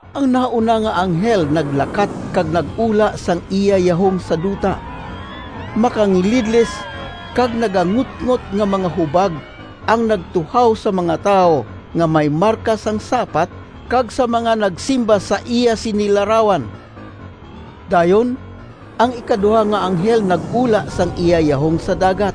Ang nahauna nga anghel naglakat kag nag-ula sang iya yahong sa duta. Makangilidlis kag nagangutngot nga mga hubag ang nagtuhaw sa mga tawo nga may marka sang sapat kag sa mga nagsimba sa iya sini larawan. Dayon ang ikaduha nga anghel nag-ula sang iya yahong sa dagat.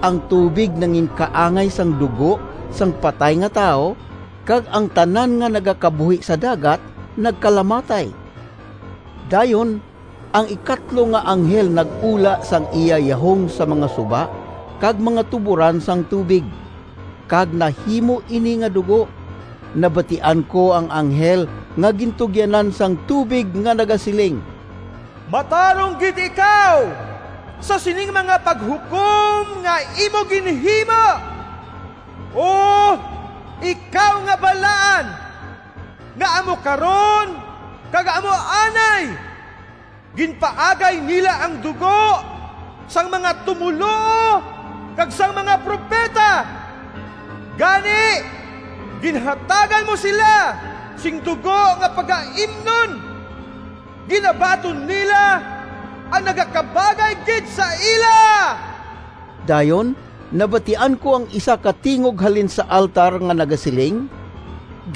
Ang tubig nanginkaangay sang dugo sang patay nga tawo, kag ang tanan nga nagakabuhi sa dagat nagkalamatay. Dayon ang ikatlo nga anghel nag-ula sang iya yahong sa mga suba kag mga tuboran sang tubig, kag nahimo ini nga dugo. Nabatian ko ang anghel nga gintugyanan sang tubig nga nagasiling, “Matarong gid ikaw sa sining mga paghukom nga imo ginhimo, O Ikaw nga Balaan, nga amo karon kag amo anay! Ginpaagay nila ang dugo sang mga tumoluo kag sang mga propeta, gani ginhatagan mo sila sing dugo nga pagaimnon. Ginabaton nila ang nagakabagay gid sa ila!” Dayon, nabatian ko ang isa ka tingog halin sa altar nga nagasiling,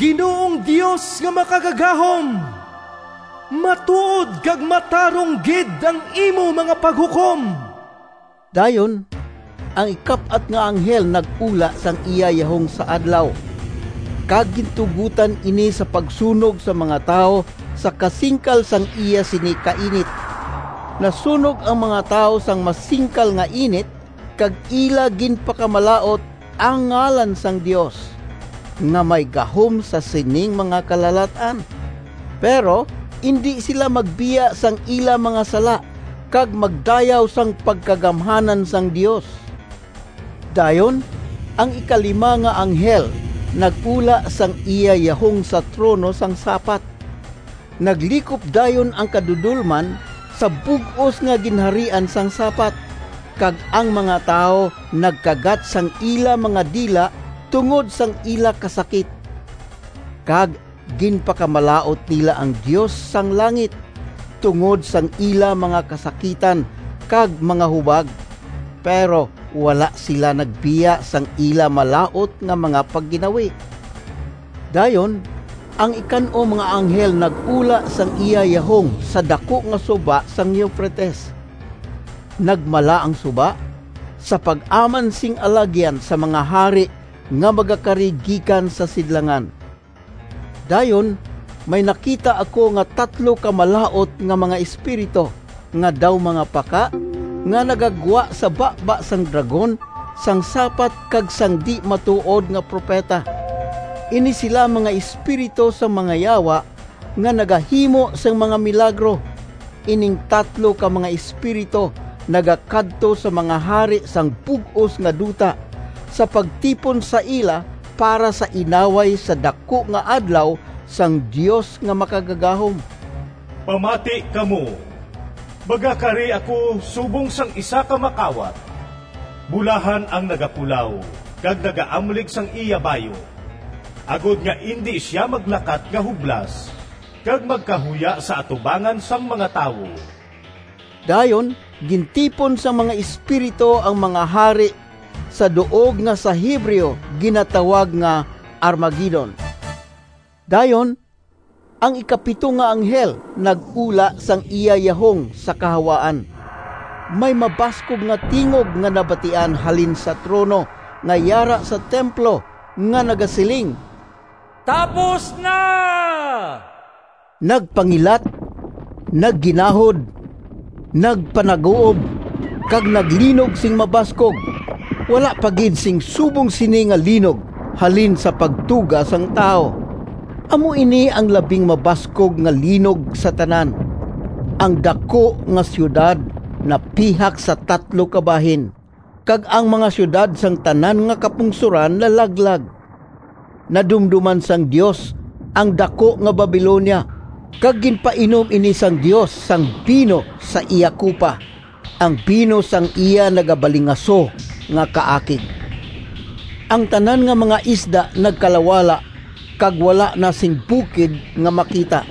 “Ginoong Dios nga Makagagahom! Matuod kag matarong gid ang imo mga paghukom!” Dayon ang ikap-at nga anghel nag-ula sang iya yahong sa adlaw, kag gintugotan ini sa pagsunog sang mga tawo sa kasingkal sang iya sini kainit. Nasunog ang mga tawo sang masingkal nga init, kag ila ginpakamalaut ang ngalan sang Dios, nga may gahom sa sining mga kalalat-an. Pero indi sila magbiya sang ila mga sala kag magdayaw sang pagkagamhanan sang Dios. Dayon ang ikalima nga anghel nag-ula sang iya yahong sa trono sang sapat. Naglikop dayon ang kadudolman sa bug-os nga ginharian sang sapat, kag ang mga tawo nagkagat sang ila mga dila tungod sang ila kasakit, kag ginpakamalaut nila ang Dios sang langit, tungod sang ila mga kasakitan kag mga hubag. Pero wala sila magbiya sang ila malaut nga mga pagginawi. Dayon ang ikan-om nga anghel nag-ula sang iya yahong sa daku nga suba sang Eufrates. Nagmala ang suba, sa pag-aman sing alagyan sa mga hari nga magakari gikan sa sidlangan. Dayon may nakita ako nga tatlo ka malaut nga mga espiritu, nga daw mga paka, nga nagagwa sa baba sang dragon, sang sapat kag sang di-matuod nga propeta. Ini sila mga espiritu sang mga yawa nga nagahimo sing mga milagro. Ining tatlo ka mga espiritu nagakadto sa mga hari sang bug-os nga duta, sa pagtipon sa ila para sa inaway sa daku nga adlaw sang Dios nga Makagagahom. “Pamati kamo! Magakari ako subong sang isa ka makawat! Bulahan ang nagapulaw kag nagaamlig sang iya bayu, agod nga indi sia maglakat nga hublas kag magkahuya sa atubangan sang mga tawo!” Dayon gintipon sang mga espiritu ang mga hari sa duog nga sa Hebreo ginatawag nga Armagedon. Dayon ang ikapito nga anghel nag-ula sang iya yahong sa kahawaan. May mabaskog nga tingog nga nabatian halin sa trono nga yara sa templo, nga nagasiling, “Tapos na!” Nagpangilat, nagginahod, nagpanaguob, kag naglinog sing mabaskog. Wala pa gid sing subong sini nga linog halin sang pagtuga sang tawo. Amo ini ang labing mabaskog nga linog sa tanan! Ang daku nga siyudad napihak sa tatlo ka bahin, kag ang mga siyudad sang tanan nga kapungsoran nalaglag. Nadumdoman sang Dios ang daku nga Babilonia, kag ginpainom ini sang Dios sang bino sa iya kupa, ang bino sang iya nagabalingaso nga kaakig. Ang tanan nga mga isla nagkalawala kag wala na sing bukid nga makita.